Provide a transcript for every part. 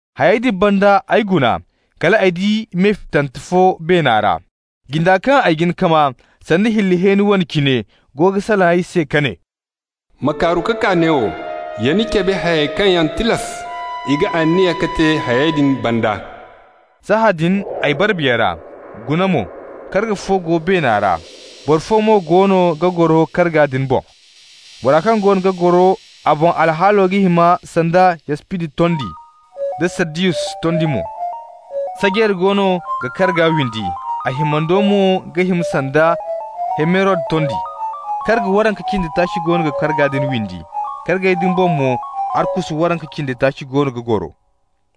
Hayey din banda ay guna, kal ay di me fitante fo beena ra. Jinda kaŋ ay jin ka maa, sanda hilli hẽeni wane cine, goono ga salaŋ ay se ka ne: «Ma kaaru ka kaa neewo, ya ni cabe hayey kaŋ yaŋ tilas i ga aniya ka te hayey din banda.» Sahãadin ay bara Biya ra. Guna mo, karga fo go beena ra, boro fo mo goono ga goro karga din boŋ. Bora kaŋ goono ga goro a boŋ alhaalo ga hima sanda yaspidi tondi da sardiyus tondi mo. Sajeera goono ga karga windi, a himando mo ga hima sanda emerod tondi. Karga waranka cindi taaci goono ga karga din windi. Kargey din boŋ mo arkusu waranka cindi taaci goono ga goro,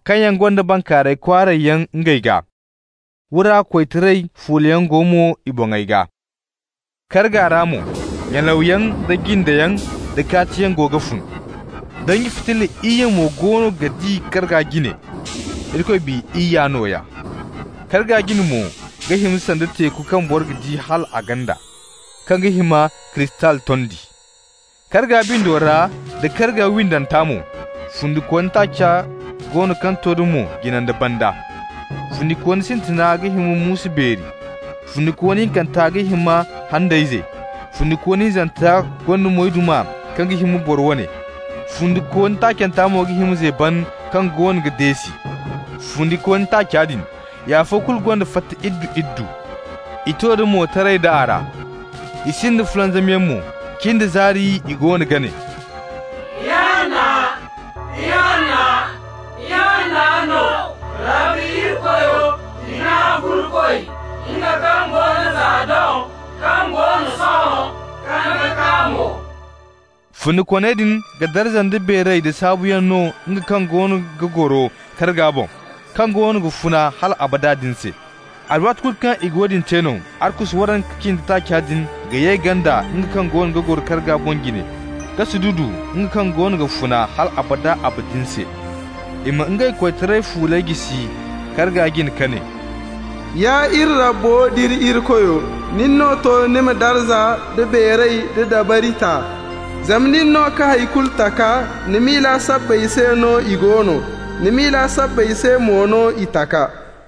kaŋ yaŋ gonda bankaaray kwaaray yaŋ ngey gaa. Wura koytaray fuulayaŋ go mo i boŋey gaa. Karga ra mo, nyalawyaŋ da jindeyaŋ da kaatiyaŋ go ga fun. Danji fitilla iyye mo goono ga di karga jine, Irikoy Biya iyya nooya. Karga jine mo ga hima sanda teeku kaŋ boro ga di hal a ganda, kaŋ ga hima kristal tondi. Karga bindo ra da karga windanta mo, fundikooni taaci go no kaŋ to da moy jine nda banda. Fundikooni sintina ga hima muusu beeri, fundikooni hinkanta ga hima handayze, fundikooni hinzanta gonda moyduma kaŋ ga hima boro wane, fundikooni taacanta mo ga hima zeeban kaŋ goono ga deesi. Fundikooni taaca din, i afo kulu gonda fata iddu-iddu. I to da moy, taray da a ra. I sinda fulanzamyaŋ mo. Cin da zaari i goono ga ne: «Ihanna, Ihanna, Ihanna no Rabbi Irikoyo, Hina-Kulu-Koy, nga kaŋ go no za doŋ, kaŋ go no sohõ, kaŋ ga kaa mo.» Fundikooney din ga darza nda beeray da saabuyaŋ no nga kaŋ goono ga goro karga boŋ, kaŋ goono ga funa hal abada abadin se. Alwaati kulu kaŋ i ga woodin te no, arkusu waranka cindi taaca din ga ye ganda nga kaŋ goono ga goro karga boŋ jine ka sududu nga kaŋ goono ga funa hal abada abadin se. I ma ngey koytaray fuuley jisi karga jine ka ne: Ya iri Rabbo d'iri Irikoyo, nin no to ni ma darza nda beeray da dabari ta. zama nin no ka hay kulu taka. Ni miila sabbay se no i go no, ni miila sabbay se mo no i taka.